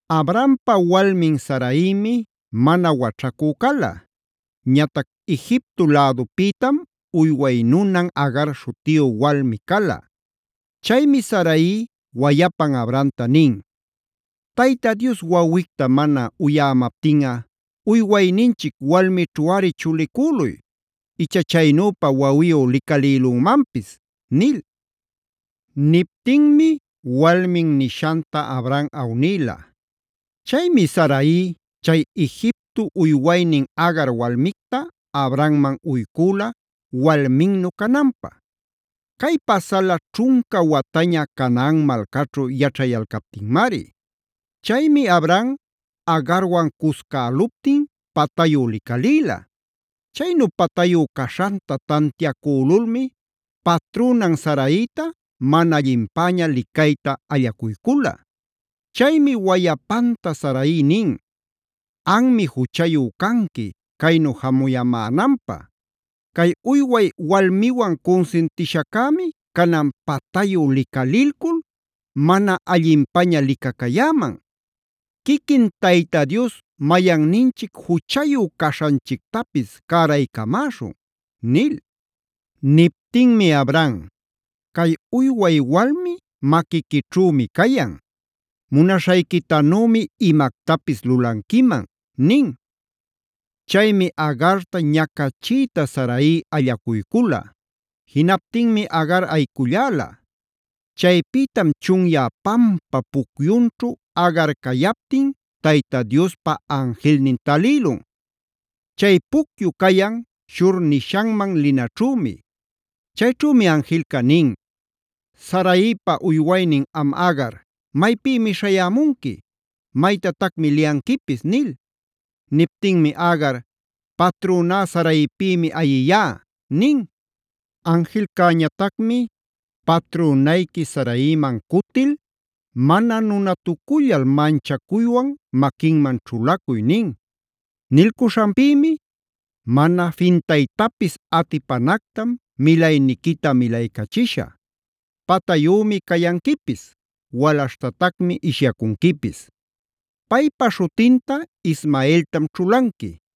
Abrampa walmin Saraimi mana waćhacü cala. Ñatac Egipto lädupïtam uyway nunan Agar śhutiyu walmi cala. Chaymi Sarai wayapan Abramta nin: Tayta Dios wawicta mana uyämaptinꞌa, uywayninchic walmićhuꞌari chulicüluy; icha chaynüpa wawiyu licalïlümanpis” nil. Niptinmi walmin nishanta Abram awnïla. Chaymi Sarai chay Egipto uywaynin Agar walmicta Abramman uycüla walminnu cananpä. Cay pasala ćhunca wataña Canaan malcaćhu yaćhayalcaptinmari. Chaymi Abram Agarwan cuscäluptin patayu licalïla. Chaynu patayu caśhanta tantiacülulmi patrünan Saraita mana allinpäña licayta allacuycula. Chaymi wayapanta Sarai nin: “Anmi juchayu canqui, caynu jamuyämänanpä. Cay uyway walmiwan cunsintishaccämi canan patayu licalilcul mana allinpaña licacayäman. ¡Quiquin Tayta Dios mayanninchic juchayu caśhanchictapis cäraycamäśhun!” nil. Niptinmi Abram: “Cay uyway walmi maquiquićhümi cayan; munaśhayquitanümi imactapis lulanquiman” nin. Chaymi Agarta ñacachiyta Sarai allacuycula; jinaptinmi Agar ayiculläla. Chaypïtam chunyä pampap pucyunćhu Agar cayaptin Tayta Diospa anjilnin talïlun. Chay pucyu cayan Shur nishanman linaćhümi. Chayćhümi anjilca nin: “Saraipa uywaynin am Agar, ¿maypïmi śhayämunqui? ¿Maytatacmi liyanquipis?” nil. Niptinmi Agar: “Patrüná Saraipïmi ayiyá” nin. Anjilcäñatacmi: “Patrünayqui Saraiman cutil, mana nunatucullal manchacuywan maquinman ćhulacuy” nin. Nilcuśhanpïmi: “Mana fintaytapis atipanactam milayniquita milaycachishä. Patayümi cayanquipis; walaśhtatacmi ishyacunquipis. Paypa śhutinta Ismaeltam ćhulanqui,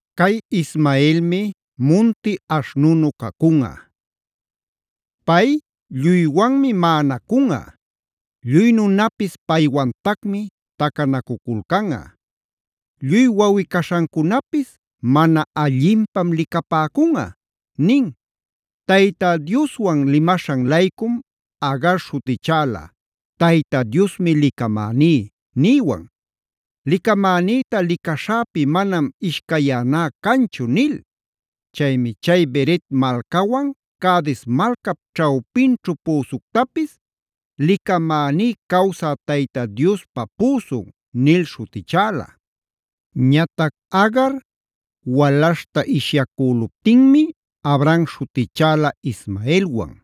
Cay Ismaelmi munti aśhnunu cacunꞌa. Pay lluywanmi maꞌanacunꞌa, lluy nunapis paywantacmi tacanacuculcanꞌa. Lluy wawꞌi-caśhancunapis mana allinpam licapäcunꞌa” nin. Tayta Diospa limaśhan-laycum Agar śhutichäla: Tayta Diosmi licamäní niywan. Licamänïta licaśhäpi manam ishcayäná canchu” nil. Chaymi chay Bered malcawan Cades malcap ćhawpinćhu püsuctapis: “Licamäní cawsä Tayta Diospa püsun” nil śhutichäla. Ñatac Agar,b walaśhta ishyacüluptinmi Abram śhutichäla Ismaelwan.